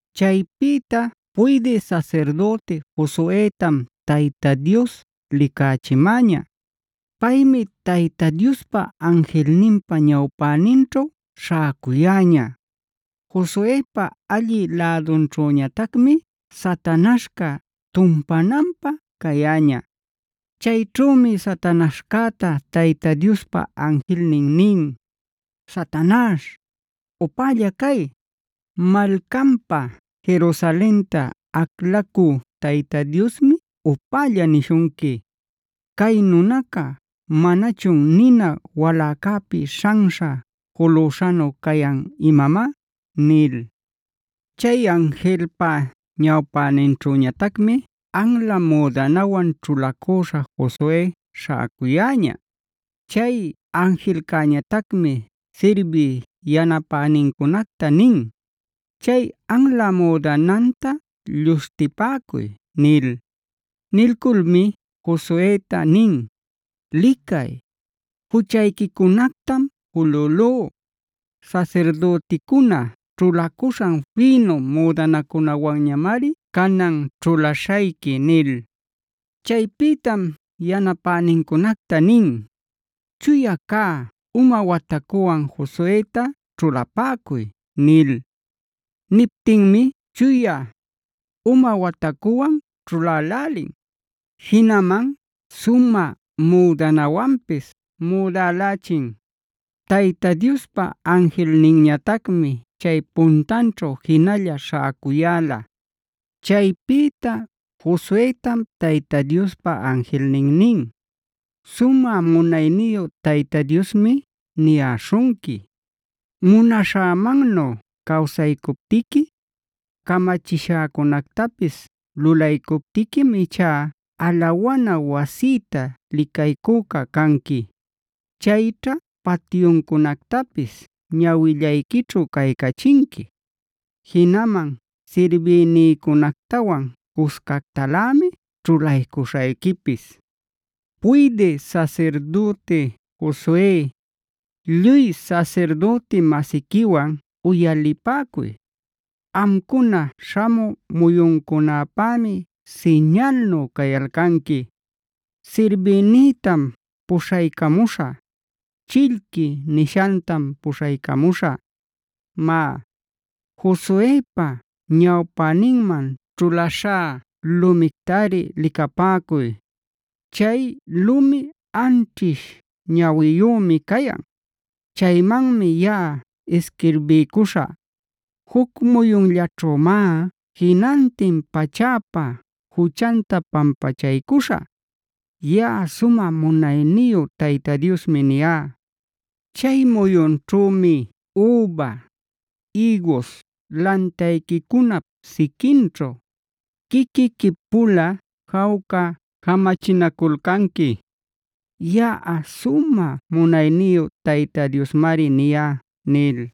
Chaypïta puydï sasirdüti Josuetam Tayta Dios licachimäña. Paymi Tayta Diospa anjilninpa ñawpäninćhu śhäcuyäña. Josuepa allï lädunćhüñatacmi Satanaśhca tumpananpä cayäña. Chayćhümi Satanaśhcäta Tayta Diospa anjilnin nin: “¡Satañaśh, upälla cay! ¡Malcanpa Jerusalenta aclacü Tayta Diosmi upälla nishunqui! ¿Cay nunaca manachun nina waläcäpi śhanśha julüśhanu cayan imamá?” nil. Chay anjilpa ñawpäninćhüñatacmi anla müdanawan ćhulacüśha Josue śhäcuyäña. Chay anjilcäñatacmi sirbiy yanapänincunacta nin: “Chay anla müdananta lluśhtipäcuy” nil. Nilculmi Josueta nin: “Licay, juchayquicunactam julülú. Sasirdüticuna ćhulacuśhan fïnu müdanacunawanñamari canan ćhulaśhayqui” nil. Chaypïtam yanapänincunacta nin: “Chuya cä uma watacuwan Josueta ćhulapäcuy” nil. Niptinmi chuya uma watacuwan ćhulälälin; jinaman sumä müdanawanpis müdälächin. Tayta Diospa anjilninñatacmi chay puntanćhu jinalla śhäcuyäla. Chaypïta Josuetam Tayta Diospa anjilnin nin: “Sumä munayniyu Tayta Diosmi niyäśhunqui: ‘Munaśhämannu cawsaycuptiqui, camachishäcunactapis lulaycuptiquim ichá alawana wasïta licaycüca canqui; chayćha patyuncunactapis ñawillayquićhu caycachinqui. Jinaman sirbïnïcunactawan cuscactalämi ćhulaycuśhayquipis. Puydï sasirdüti Josue, lluy sasirdüti-masiquiwan uyalipäcuy. Amcuna śhamü muyuncunapämi siñalnu cayalcanqui. Sirbïnïtam puśhaycamuśhä; “Chillqui” nishantam puśhaycamuśhä. Má, Josuepa ñawpäninman ćhulaśhá lumictari licapäcuy. Chay lumi anćhish ñawiyümi cayan; chaymanmi yaꞌa isquirbiycuśhä. Juc muyunllaćhümá jinantin pachäpa juchanta pampachaycuśhä. Yaꞌa sumä munayniyu Tayta Diosmi niyá. Chay muyunćhümi üba, ïgus lantayquicunap siquinćhu quiquiqui-pula jawca jamachinaculcanqui. Yaꞌa sumä munayniyu Tayta Diosmari niyá’” nil.